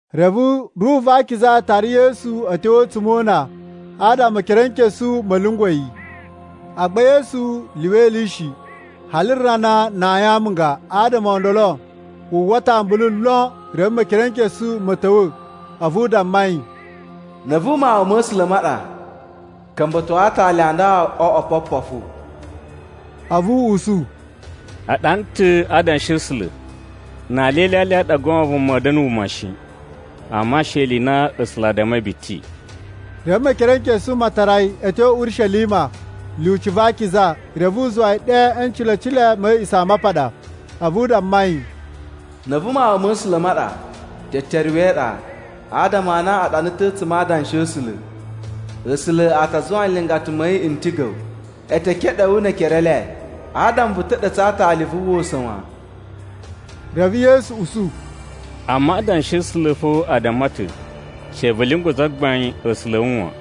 Reve Ruhu va Akiza tara Yesu a̱ tyo a̱tsuma̱ o una, adama Mekerenkesu ma̱ lyungwa̱ yi. Agba Yesu lyuwa ili shi, hali rana na ayin amunga. Adama o ndolo, wu uwwa ta̱ ambulu lon. Reve Mekerenkesu ma̱ ta̱wa̱ a̱vu u damma yi, “Na̱ a̱vu Mawun ma̱ A̱sula̱ ma ɗa, ka̱mba̱to atali a nda o oꞌwo opopofu.” A̱vu u usu, “A ɗana ta̱ a Adanshi a̱ A̱sula̱, ‘Na alya e ilyalya i ɗa goon vuma a̱a̱ da̱na̱ wuma shi, amma she ni ili i na A̱sula̱ a dammai biti.’” Reve Mekerenkesu ma tara yi a̱ tyo Urishelima lyuci va akiza, reve u zuwa yi ɗe e ncilecile ma̱ A̱a̱ꞌisamapaɗa. A̱vu u damma yi, “Na̱ a̱vu Mawun ma̱ A̱sula̱ ma ɗa, teteruwe e iɗa, adama a na a ɗana ta̱ a̱tsuma̱ a Adanshi a̱ A̱sula̱: ‘A̱sula̱ a ta zuwa nlingata ma̱ yi n tiga̱ wu, e te keɗe wu ne ekere e le, adama vu ta̱ɗa̱tsa̱ a aatali vu uwwa usa̱n wan.’” Reve Yesu usu, “Amma Adanshi a̱ A̱sula̱ fo a damma ta̱, ‘She vu lyungwa̱ Zagbain A̱sula̱ a̱ wu wan.’”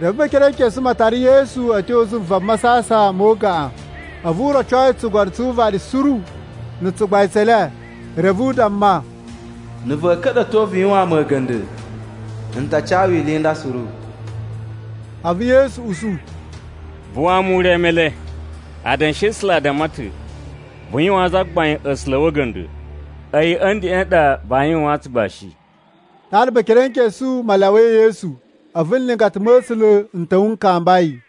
Reve Mekerenkesu ma tara Yesu a̱ tyo zuva masasan mo ugaꞌan, a̱vu u roco yi tsugono tsu uvaɗi suru na̱ tsugbain tse ele. Reve u damma, “Na̱ va̱a̱ ka̱ɗa̱to vu yuwaan mu a̱ga̱nda̱, n ta ca wu ili i nda suru.” A̱vu Yesu usu, “Buwaa mu ure Male! Adanshi a̱ A̱sula̱ a damma ta̱, ‘Vu yuwaan Zagbain A̱sula̱ a̱ wu a̱ga̱nda̱, a̱yi a̱ ndeꞌen ɗa vaa yuwaan tsugbashi!’” Ɗaɗa Mekerenkesu ma lyawai Yesu, a̱vu nlingata ma̱ A̱sula̱ n ta̱wa̱ n kamba yi.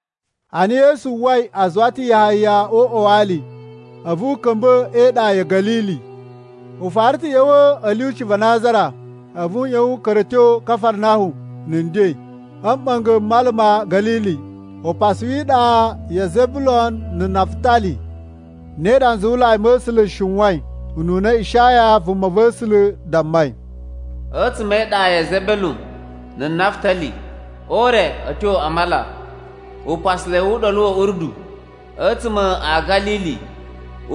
Ana Yesu uwwai a zuwa ta̱ Yahaya o uꞌwa wa ali, a̱vu u ka̱mba̱ e iɗa ya̱ Ga̱lili. U fara ta̱ ꞌya̱wa̱ a̱ lyuci va Nazara, a̱vu u ꞌyon u ka̱ra̱ a̱ tyo Kafarnahum na̱ nden, a̱ mɓa̱nga̱ m Mala ma̱ Ga̱lili, upasu wi iɗa ya Zebelun na̱ Nafutali. Ne ɗa nzuwulai ma̱ A̱sula̱ n shiwain ununa Ishaya vumava̱sula̱ dammai: “A̱tsuma̱ e iɗa ya Zebelun na̱ Nafutali, o ure a̱ tyo a mala, upasalai wu Uɗolu wa̱ Urdu, a̱tsuma̱ a̱ Ga̱lili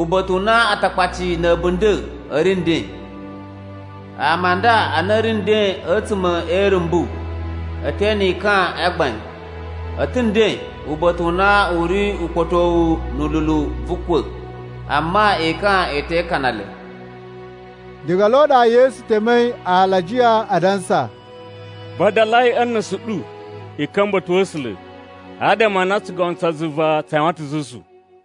uba̱ta̱ u na Atakpaci na̱ a̱bunda̱ a̱ ri nden. Ama a nda a na a̱ ri nden a̱tsuma̱ e irumbu e te ene ekan a gbain. A̱ ta̱ nden uba̱ta̱ u na u ri ukpa̱towu na̱ lulu vu ukwa̱, amma ekan e te ikana le.” Diga lo ɗa Yesu temei alajiya adansa, “Vadalai a̱ nusu ɗu i ka̱mba̱ uba̱ta̱ wa̱ A̱sula̱, adama a na tsugono tsa zuva tsa yuwan ta̱ zuzu.”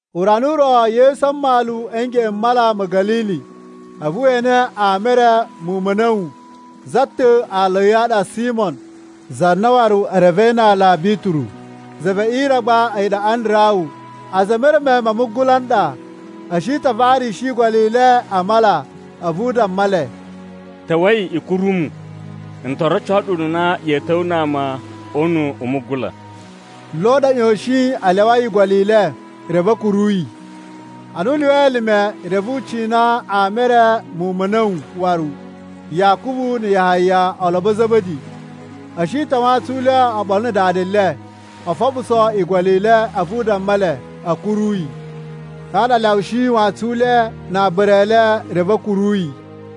Urana u ro, Yesu a mmalu a̱ ngeꞌen m Mala ma̱ Ga̱lili, a̱vu we ene ama e re muwun ma̱ a̱na̱wu. Za ta̱ aala a̱ yi a ɗa Simo za na waru e revei na aala Bituru, za ve ire gba a̱yi ɗa Andarawu. A̱za̱ e mereme ma mugula n ɗa, a̱ shi ta̱ a varishi igolo i le a mala. A̱vu u damma le, “Ta̱wa̱i i kuru mu! N to roco ɗu ununa ya̱a̱ ta̱wa̱a̱ na ama o una̱ u mugula.” Lo ɗa a̱ ꞌyoshin a lyawai igolo i le, reve a̱ kuru yi. Ana u lyuwai elime, reve u cina ama e re muwun ma̱ a̱na̱wu waru, Yakubu na̱ Yahaya, olobo a̱ Za̱ba̱di. A̱ shi ta̱ a wantsun u le oɓolo na̱ dada le, o foɓuso igolo i le. A̱vu u damma le a̱ kuru yi. Ɗaɗa a lyawushi wantsun u le na aabara e le, reve a̱ kuru yi.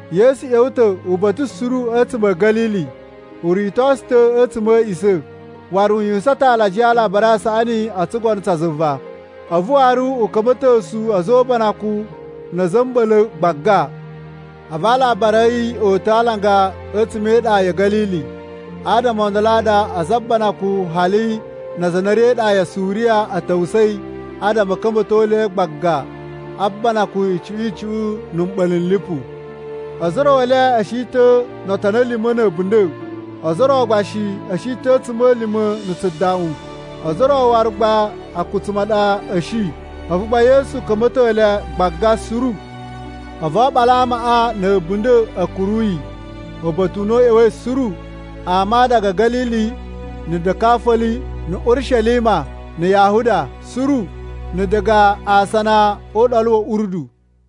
Yesu ꞌya̱wa̱ ta̱ uba̱ta̱ suru a̱tsuma̱ a̱ Ga̱lili. U ritosu ta̱ a̱tsuma̱ a̱ a̱ꞌisa̱. Waru u yuwusan ta̱ alajiya a Alabari a Saꞌani o tsugono tsa zuva. A̱vu waru u ka̱mba̱tosu a̱za̱ o ubanakun na̱ a̱za̱ a̱ mɓa̱la̱ gbaga. A̱vu alabari a̱ yi o uta̱ a alanga a̱tsuma̱ e iɗa ya̱ Ga̱lili, adama o ndolo a ɗa a̱za̱ o ubanakun, hali na aza a na a̱ ri e iɗa ya Suriya, a̱ ta̱wusa̱i adama a̱ ka̱mba̱to le gbaga a banakun icuꞌun icuꞌun na̱ mɓa̱la̱ n lipu. Ozo o ro e le a̱ shi ta̱ no otoni a̱ lima̱ na̱ a̱bunda̱, ozo o ro gba shi a̱ shi ta̱ a̱tsuma̱lima̱ na̱ tsudaꞌun, ozo o ro waru gba a̱kutsuma̱ a ɗa a̱ shi. A̱vu gba Yesu ka̱mba̱to le gbaga suru. A̱vu oɓolo a amaꞌa na̱ a̱bunda̱ a̱ kuru yi uba̱ta̱ u na u ꞌya̱wa̱i suru: ama diga Ga̱lili, na̱ Dikafoli, na̱ Urishelima, na̱ Yahuda suru, na̱ diga asana o Uɗolu wa̱ Urdu.